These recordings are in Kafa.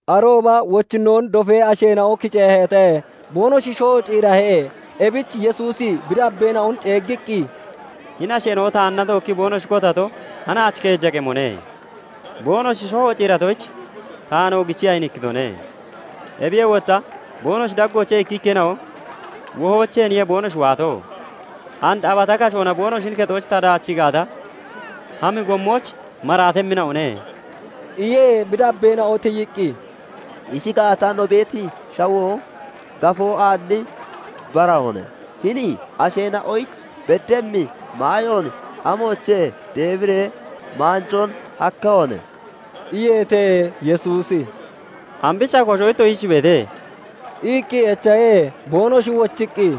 Arooba wochinnoon dofee asheena'o kiceeheete. Boonoshi shoho ciirahe. Ebich Yesuusi bi dabbeena'on ceeggiqqi, "Hini asheena'o taanna tookkii boonoshi kotato hanaach keeja qemone. Boonoshi shoho ciiratoyich taan oogichii ayinikkitone. Ebiyee wotta boonoshi daggoochee ikkikkeena'o wohoocheeniye boonoshi waato. And abata kashoona boonoshin kexooch ta daachii gaata, hami gommooch maraatemmina'one" iye. Bi dabbeena'o tiyiqqi, "Ishi gaata, no beeti shawoo gafoo aalli barahoone; hini asheena'oyich beddemmi maayoon amoochee deebiree maanjoon hakkehone?" iyeete. Yesuusi "Ambicha kosho ittoshich beete?" iqqi echahe. Boonoshi wochiqqi,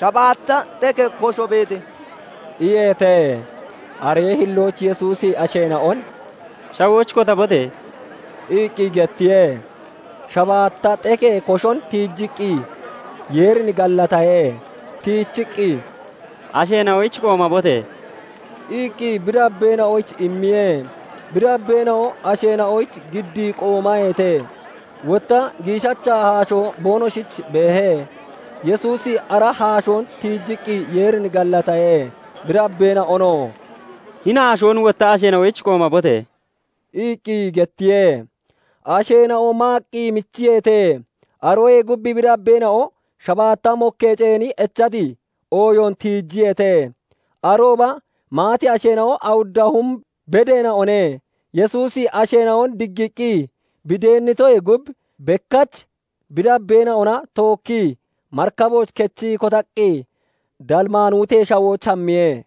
"Shabaatta xekee kosho beete" iyeete. Aree hillooch Yesuusi asheena'on "Shawooch kotabote!" iqqi gettiye. shabaatta xekee koshon tiijiqqi Yeerin gallatahe. Tiichiqqi, "Asheena'oyich qoomabote!" iqqi bi dabbeena'oyich immiye. Bi dabbeena'o asheena'oyich giddii qoomaheete. Wotta giishacha haashoo boonoshich beehe; Yesuusi ara haashoon tiijiqqi Yeerin gallatahe. Bi dabbeena'onoo "Hini haashoon wotta asheena'oyich qoomabote!" iqqi gettiye. Asheena'oo maaqqi michiyeete. Aroyee gub bi dabbeena'o shabaatta mokkee ceeni echati ooyoon tiijiyeete. Arooba maati asheena'o awudda hum bedeena'one. Yesuusi asheena'on diggiiqqi bi deennitoyee gub, bekkach bi dabbeena'ona tookkii marikabooch kechii kotaqqi Dalmaanutee Shawooch hammiye.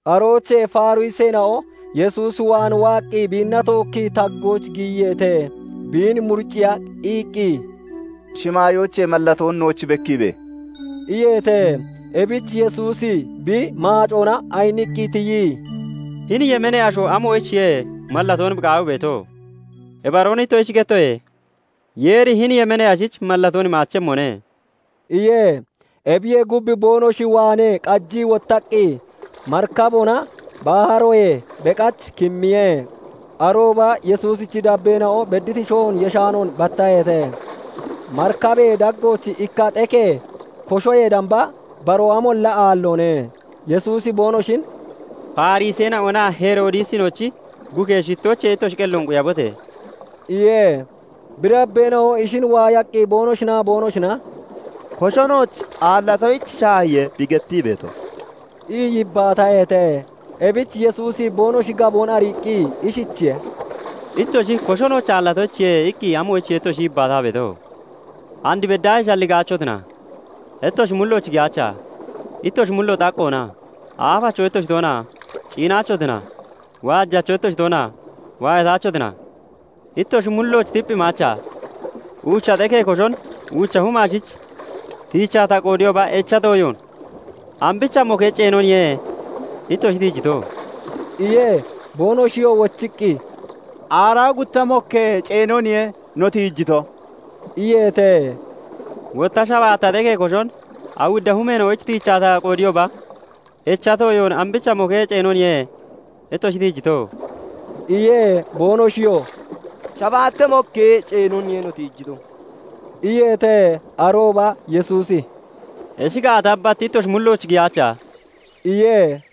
Aroochee Fariseena'o Yesuus waan waaqqi biinna tookkii taggooch giyiyeete. Biin muriciiya iqqi, "Shimaayoochee mallatoon nooch bekkiibe!" iyeete. Ebich Yesuusi bi maacoona ayiniqqi tiyii, "Hini yemeenee asho amoyichiye mallatoon bi qaawii beeto? Ibaroon ittoshich gettoye; Yeeri hini yemeenee ashich mallatoon imaachemmone" iye. Ebiyee gub, boonoshi waanee qajii wottaqqi marikaboona baharoyee beqach kimmiye. Arooba Yesuusichi dabbeena'o bedditi shohoon yeshaanoon battaheete. Marikabee daggooch ikka xekee koshoyee damba baroo amolla aalloone. Yesuusi boonoshin, "Fariseena'onaa Heroodisinoch bukee shittoochee ittoshi qelloon quyabote!" iye. Bi dabbeena'o ishin waayaqqi boonoshinaa boonoshina "Kosho nooch aallatoyich shaahiye, bi gettii beeto" ii yibbaataheete. Ebich Yesuusi boonoshi gaboon ariiqqi ishichiye:- "Ittoshi 'Kosho nooch aallatoyichiye' iqqi amoyichiye ittoshi yibbaataa beeto? And beddaahee shalligaachotina? Ittoshi mullooch giyaacha? Ittoshi mullo xaqqoona? Aafacho ittoshi toona? Ciinaachotina? Waajacho ittoshitoona? Waayataachotina? Ittoshi mullooch tipphimaacha? Uucha xekee koshon uucha huma ashich tiichaa ta qoodiyooba, echati ooyoon ambicha mokkee ceenoniye ittoshi tiijito?" iye. Boonoshiyoo wochiqqi, "Aaraa gutta mokkee ceenoniye no tiijito" iyeete. "Wotta shabaatta xekee koshon awudda humeena'oyich tiichaa ta qoodiyooba echati ooyon ambicha mokkee ceenoniye ittoshi tiijito?" iye. Boonoshiyoo "Shabaata mokkee ceenoniye no tiijito" iyeete. Arooba Yesuusi "Ishi gaata, bat ittoshi mullooch giyaacha?" iye.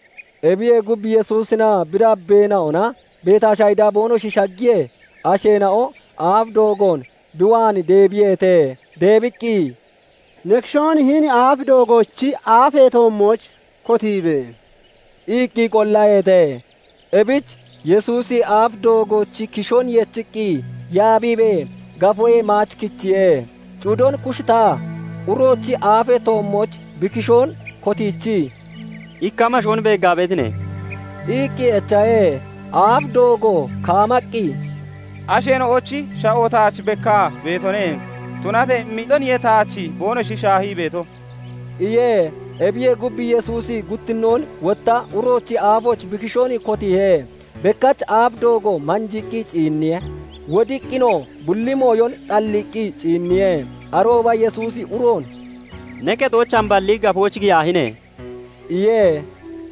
Ebiyee gub, Yesuusinaa bi dabbeena'ona Betashayida boonoshi shaggiyee, asheena'o aaf doogoon bi waan deebiyeete. Deebiqqi, "Ne kishoon hini aaf doogoochi aafee toommooch kotiibe!" iqqi qollaheete. Ebich Yesuusi aaf doogoochi kishoon yechiqqi yaabiibee gafoyee maach kichiye. Cudon kushitaa (kuujii) uroochi aafee toommooch bi kishoon kotiichii, "Ikka amashoon beeggaa beetine?" iqqi echahe. Aaf doogo kaamaqqi, "Asheena'ochi sha'o taach bekkaa beetone; tunatee mixoniye taach boonoshi shaahii beeto" iye. Ebiyee gub, Yesuusi guttinnoon wotta uroochi aafooch bi kishoon kotiihe. Bekkach aaf doogo manjiiqqi ciinniye. Wodiqqinoo bulli mooyon xalliiqqi ciinniye. Arooba Yesuusi uroon "Ne kexooch hamballi, gafooch giyaahine!" iye.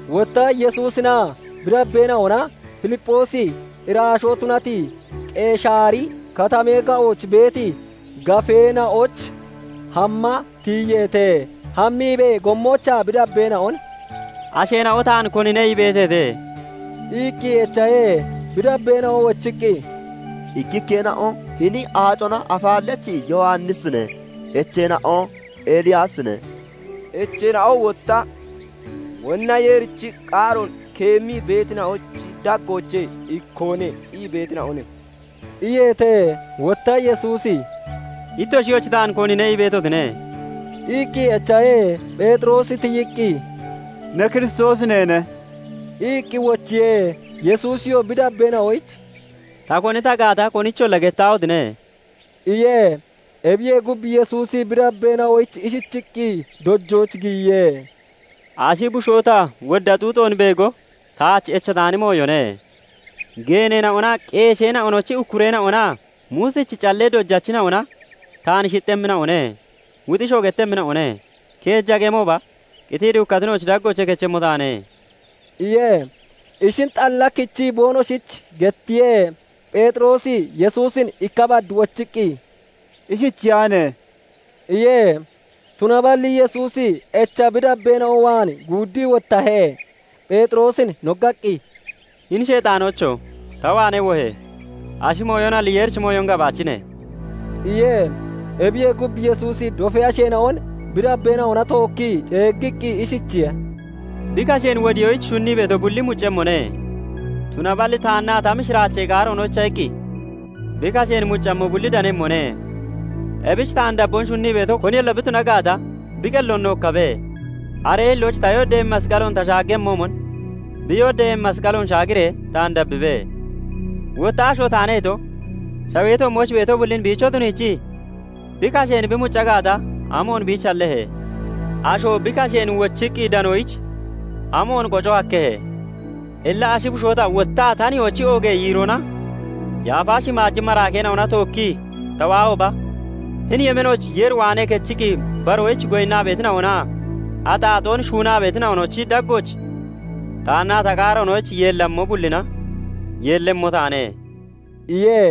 Wotta Yesuusinaa bi dabbeena'ona Filipphoosi irashoo tunati Qeshaari Katamee ga'ooch beeti gafeena'ooch hamma tiyiyeete. Hammiibee gommoochaa bi dabbeena'on "Asheena'o taan konine ii beeteete?" iqqi echahe. Bi dabbeena'o wochiqqi, " ikkikkeena'o 'Hini Aacona Afaallachi Yowannisine', echeena'o 'Eliyaasine', echeena'oo wotta 'Wonna Yeerichi qaaroon keemmii beetina'ochi daggoochee ikkoone' ii beetina'one" iyeete. Wotta Yesuusi "Ittoshiyochi, taan konine ii beetotine?" iqqi echahe. Pheexiroosi tiyiqqi, "Ne Kiristoosi neene" iqqi wochiye. Yesuusiyoo bi dabbeena'oyich "Ta koni ta gaata konicholla gettaahotine!" iye. Ebiyee gub, Yesuusi bi dabbeena'oyich ishichiqqi dojooch giyiye; "Ashi bushoo ta wodda xuuxoon beego taach echataani mooyone. Geeneena'onaa qeesheena'ochi ukkureena'ona, Muusichi callee dojachina'oo taan shixxemmina'one; wuxiishoo gettemmina'one. Keeja qemooba qitii duukkatina'ochi daggoochee kechemmo taane" iye. Ishin xalla kichii boonoshich gettiye. Pheexiroosi Yesuusin ikka bad wochiqqi, "Ishichiyaahine!" iye. Tunaballi Yesuusi echa bi dabbeena'o waan guuddii wottahe; Pheexiroosin noggaqqi, "Hini sheexaanoocho! Ta waanee wohe! Ashi mooyonalli Yeerichi mooyon gabaachine" iye. Ebiyee gub, Yesuusi dofee asheena'on bi dabbeena'ona tookkii ceeggiqqi ishichiye:- "Bi kasheen wodiyoyich shunnii beeto bulli muccemmone; tunaballi taannaa ta mishiraachee qaaroonoyicha iqqi bi kasheen muccammo bulli danemmone. Ebich taan dabboon shunnii beeto koniyolla bi tuna gaata, bi qelloon nookkabe; aree hillooch ta yooddeeyemmi masqaloon ta shaaggemmoomon, bi yooddeeyemmi masqaloon shaagiree taan dabbibe. Wotta 'Asho taane' ito, shawee toommooch beeto bullin biicho tuniichii bi kasheen bi mucca gaata, amoon biich hallehe? Asho bi kasheen wochiqqi danoyich amoon qoco hakkehe? Illa ashi bushoo ta wotta ta nihoochi oogee yiiroona yaafa shimaaji maraakeena'ona tookkii ta waahooba, hini yemeenooch Yeer waanee kechiqqi baroyich goyinnaa beetina'onaa axaaxoon shuunaa beetina'onochi daggooch taannaa ta qaaroonoyich yeellammo bullina yeellemmo taane" iye.